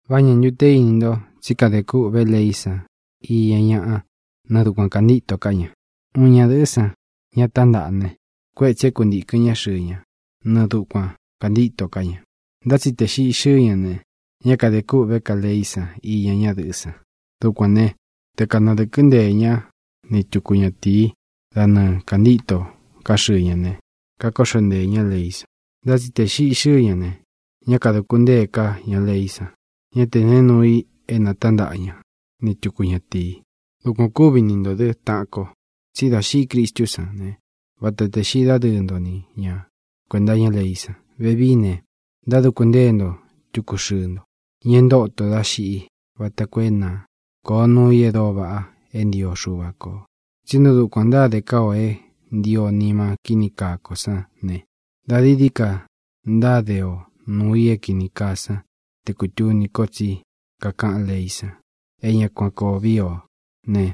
¿Vá ñā ntu te íni nto tsí kadē kûꞌvé leí san iña ñaꞌa nɨɨ dukuan kāntíto ká ña? Uun ñadɨ̄ꞌɨ́ san, ña tántaꞌa ne, kuétsī é kuntīkɨn ñá xɨɨ ña nɨɨ dukuan kāntíto ká ña. Ntá tsi tē xiꞌi xɨ́ɨ ña ne, ñá kadē kûꞌvé ka leí san iña ñadɨꞌɨ́ san. Dukuān né, te kanadɨ̄kɨ́ nteē ñá ni tuku ñatīí da nɨɨ kāntíto ká xɨɨ ña ne, kakóꞌxo nteē ñá leí san. Ntá tsi tē xiꞌi xɨ́ɨ ña ne, ñá kadūku ntée ká ña leí san. Ñá tē neé nuu i te natántaꞌa ña ni tuku ñatīi. Dukuān ó kuvi ni ntō dɨ́, taꞌan ko. Tsí dā xiꞌi Cristú san ne, vata tē xiꞌi dádɨɨ́ nto ni ña kuēnta iñá leí san. Vevií ne, ntáduku ntée nto tuku xɨɨ nto, ña e ntóto dá xiꞌi vata koo é na kōo nuu i e dóo vaꞌa é ntio Xuva kō. Tsí nɨɨ dukuān ntáde ká o é ntio nima kíni kaa ko sán ne, dā dií dií ka ntáde o nuū i é kini kaa san tē kutuni ko tsí kakaꞌán leí san é ña kuan koo víi ō né,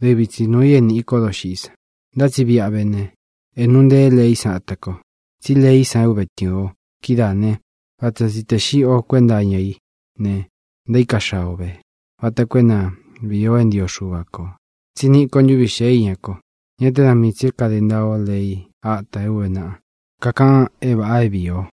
dɨvi tsi nuū i é nīꞌi kó doxiꞌí san. Ntá tsi viꞌa vé ne, é nūu nteé leí san ata ko, tsí leí san é uve tɨ̄ɨn o kídaā né, vata tsi tē xiꞌi o kuénta iña í ne, e ntaíka xaa ō ve, vata koo é na vīi o é ntio Xuva kō, tsí niꞌi ko ntúvi xēé iña ko, ñá te dā míi tsī é kāde ntaa o lei átā é ūve naꞌa kakaꞌan é vāꞌa é vīi o.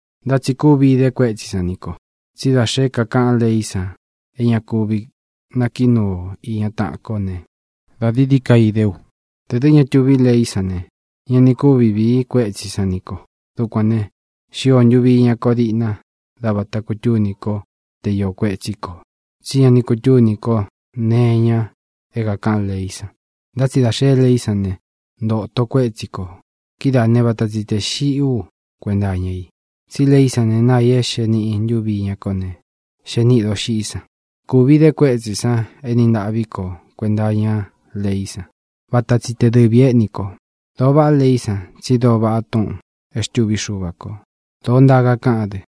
Ntá tsi kúvi īde kuétsī san ní ko, tsí da xé kakaꞌán leí san é ña kúvi nakiꞌi núu o īña taꞌan kó ne, dā dií dií ka idé u. Tē dɨ́ ña túvi leí san ne, ña ni kúvi vīí kuétsī san ní ko. Dukuān ne, xío ntūvi iñá ko diꞌna dá vāta kutúní ko te īo kuétsī ko, tsí ña ni kutúní ko nee iña é kākaꞌán leí san. Ntá tsi dā xeé leí san ne, ntōto kuétsī ko. Kidáā né, vata tsi tē xiꞌí u kuenta iña i. Tsí leí san ne, náa ī é xee niꞌi ntúvi iñá ko ne, xee níꞌī doxiꞌí san. Kūvi ide kuétsī san éni ntaꞌví ko kuenta iñá leí san. Vata tsi te dɨvī éꞌni ko. Dōo vaꞌá leí san, tsi dóo vaꞌá túꞌūn e xtûví Xuva kō. Dōo ntaa kakáꞌán dɨ.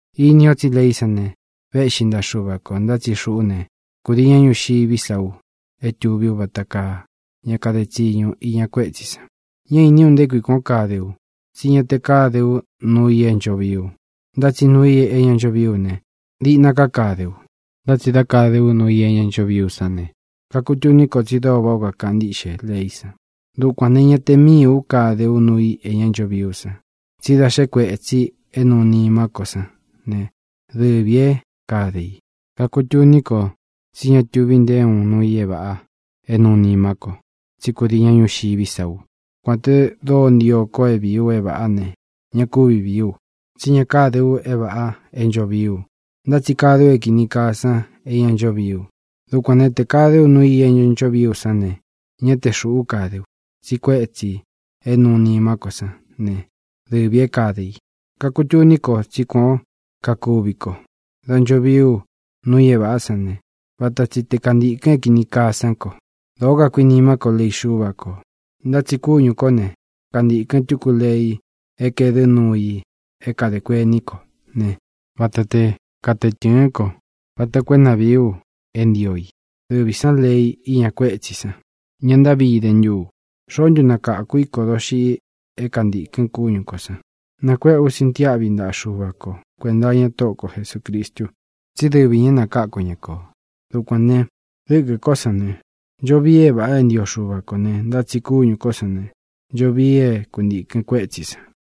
Ini o tsí leí san ne, véꞌxi ntaꞌa Xuva kō. Ntá tsi xuꞌú ne, kudii ña ñuxiví sa u é tuví u vata kaa ña kade tsiñu iña kuétsī san. Ñá īní u nté kui kuān ó kade u. Tsi ñá te kāde ú nuu i é ncho vií u, ntá tsi nuu i é ña ncho vií u ne, diꞌna ká kade u. Ntá tsi dá kāde ú nuu i é ña ncho vií u sán ne, kakutuní ko tsi dóo váꞌā ó kakaꞌan ntíꞌxe leí san. Dukuān ne, ña te míī ú kade ú nuu i é ña ncho vií u san, tsí da xe kuétsī é nūu nimá ko sán ne, dɨvī é kade i. Kakutuní ko tsí ña tuvi nté uun nuu i é vāꞌa é nūu nimá ko, tsí kudii ña ñuxiví sa u. Kuān te dóo ntio ko é vīí u é vāꞌá ne, ña kúvi vīí u. Tsí ña káde u é vāꞌa é ncho vií u, ntá tsi kade u é kīni kaa san é ña ncho vií u. Dukuān né, tē kade ú nuu i é ña ncho vií u sán ne, ñá te xūꞌú kade ú, tsi kuétsī é nuu nimá ko sán ne, dɨvī é kāde i. Kakutuní ko tsí kuān ó kakuvi ko: Dā ncho vií u nuu i é vāꞌa sán ne, vata tsi te kantīkɨn é kīni kaa sán ko. Dōo kakuinimá ko lei Xúva kō, ntá tsi kúñū kó ne, kantīkɨn túku lei é kaēdɨ́ nuu i é kadē kuení ko ne, vata te katee tɨ̄ɨ́n ko vata koo é na vīí u é ntio i. Dɨvī sán lei íña kuétsī san. ¡Ñā ntáꞌvi idé ntu u! ¿Xoó ntu nakakū í ko doxiꞌi é kantīkɨn kúñū kó san? ¡Nakuéꞌe ú sintiáꞌvi ntaꞌa Xuva ko kuēnta iña Tóꞌo ko Jesūcristu, tsí dɨvi ñā é nakáku ña ko! Dukuān ne, dɨ́kɨ̄ kó san ne, ncho vii é vāꞌa é ntio Xuva kō ne, ntá tsi kúñū kó san ne, ncho vii é kuntīkɨn kuétsī san.